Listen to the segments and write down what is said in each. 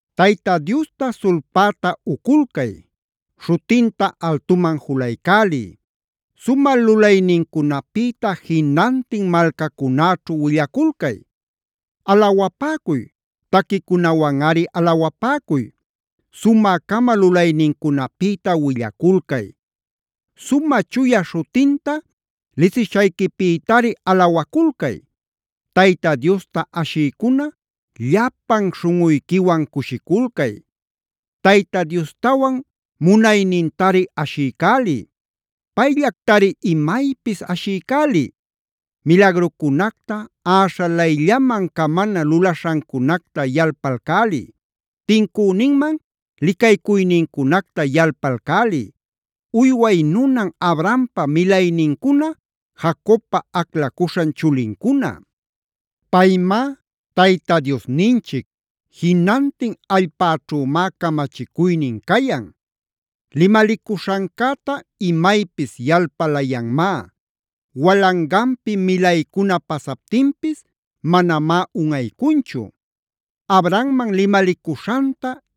Tayta Diosta sulpäta uculcay; śhutinta altuman julaycäliy. Sumä lulaynincunapïta jinantin malcacunäćhu willaculcay. Alawapäcuy; taquicunawanꞌari alawapäcuy. Sumä-cama lulaynincunapïta willaculcay. Sumä chuya śhutinta lisishayquipïtari alawaculcay. Tayta Diosta ashïcuna llapan śhunꞌuyquiwan cushiculcay. Tayta Diostawan munaynintari ashiycäliy. Payllactari imaypis ashiycäliy. Milagrucunacta, äśhalayllaman camana lulaśhancunacta yalpalcäliy. Tincüninman licaycuynincunacta yalpalcäliy, uyway nunan Abrahampa milaynincuna, Jacobpa aclacuśhan chulincuna. Paymá Tayta Diosninchic. Jinantin allpäćhümá camachicuynin cayan. Limalicuśhancäta imaypis yalpalayanmá. Walanganpi milaycuna pasaptinpis manamá unꞌaycunchu. Abrahamman limalicuśhanta,a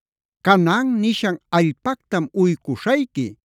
“Canaan nishan allpactam uycuśhayqui.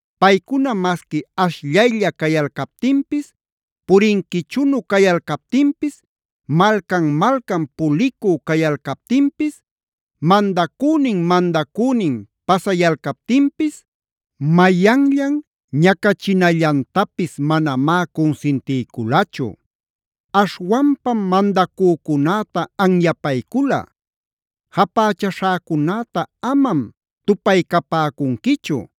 Paycuna masqui ashllaylla cayalcaptinpis, purinquichunu cayalcaptinpis, malcan-malcan pulicü cayalcaptinpis, mandacünin-mandacünin pasayalcaptinpis, mayanllan ñacachinallantapis manamá cunsintiyculachu. Aśhwanpam mandacücunäta anyapaycula: “Japächaśhäcunäta amam tupaycapäcunquichu.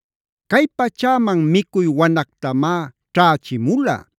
Cay pachäman micuy wanactamá ćhächimula.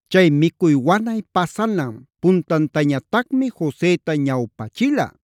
Chay micuy wanay pasanan puntantañatacmi Joseta ñawpachila.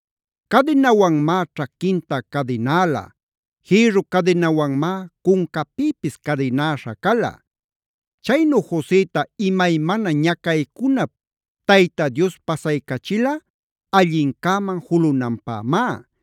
Cadinawanmá ćhaquinta cadinäla. Jïrru cadinawanmá cuncapïpis cadinäśha cala. Chaynu Joseta imaymana ñacaycunap Tayta Dios pasaycachila allincäman julunanpämá.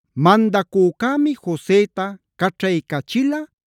Mandacücämi Joseta caćhaycachila,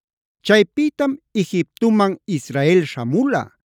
Chaypïtam Egiptuman Israel śhamula.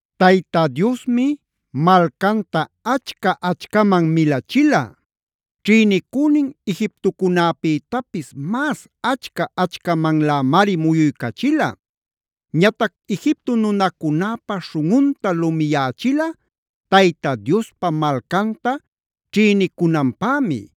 Tayta Diosmi malcanta achca-achcaman milachila. Ćhïnïcünin Egiptocunapïtapis mas achca-achcamanlämari muyuycachila. Ñatac Egipto nunacunäpä śhunꞌunta lumiyächila Tayta Diospa malcanta ćhïnicunanpämi;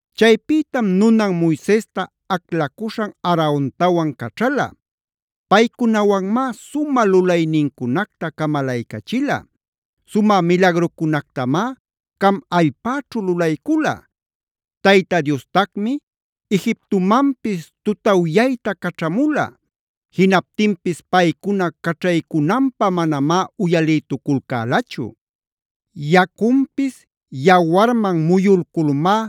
Chaypïtam nunan Moisesta aclacuśhan Aarontawan caćhala.l Paycunawanmá sumä lulaynincunacta camalaycachila. Sumä milagrucunactamá Cam allpäćhu lulaycula. Tayta Diostacmi Egiptumanpis tutawyayta caćhamula.m Jinaptinpis paycuna caćhaycunanpä manamá uyalïtuculcälachu. Yacunpis yawarman muyulculmá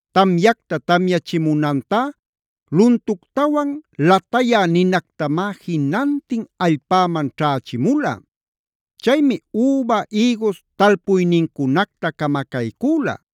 Tamyacta tamyachimunantá luntuctawan latayä ninactamá jinantin allpäman ćhächimula. Chaymi üba, ïgus talpuynincunacta camacaycüla.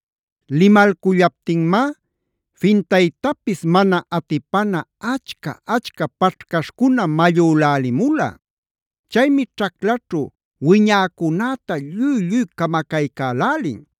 Limalcullaptinmá fintaytapis mana atipana achca-achca paćhcaśhcuna mallülälimula. Chaymi ćhaclaćhu wiñäcunäta lluy-lluy camacaycälälin.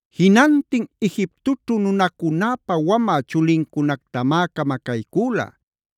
Jinantin Egiptoćhu nunacunäpa wamä chulincunactamá camacaycüla.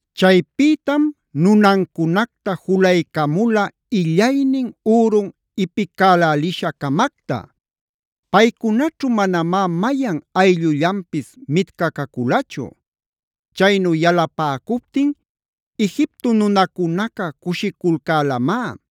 Chaypïtam nunancunacta julaycamula illaynin, ürun ipipacälälisha-camacta. Paycunaćhu manamá mayan ayllullanpis mitcaculachu. Chaynu yalapäcuptin Egipto nunacunaca cushiculcälamá.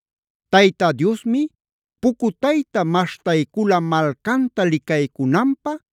Tayta Diosmi pucutayta maśhtaycula malcanta licaycunanpä,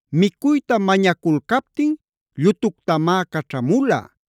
Micuyta mañaculcaptin llutuctamá caćhamula.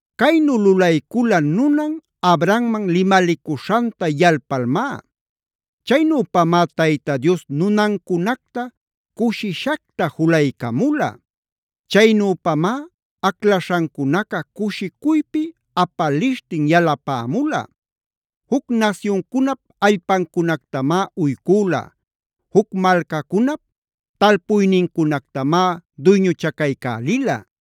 Caynu lulaycula nunan Abrahamman limalicuśhanta yalpalmá. Chaynüpamá Tayta Dios nunancunacta cushishacta julaycamula. Chaynüpamá aclaśhancunaca cushicuypi apalishtin yalapämula. Juc nasyuncunap allpancunactamá uycüla.y Juc malcacunap talpuynincunactamá duyñuchacaycälila.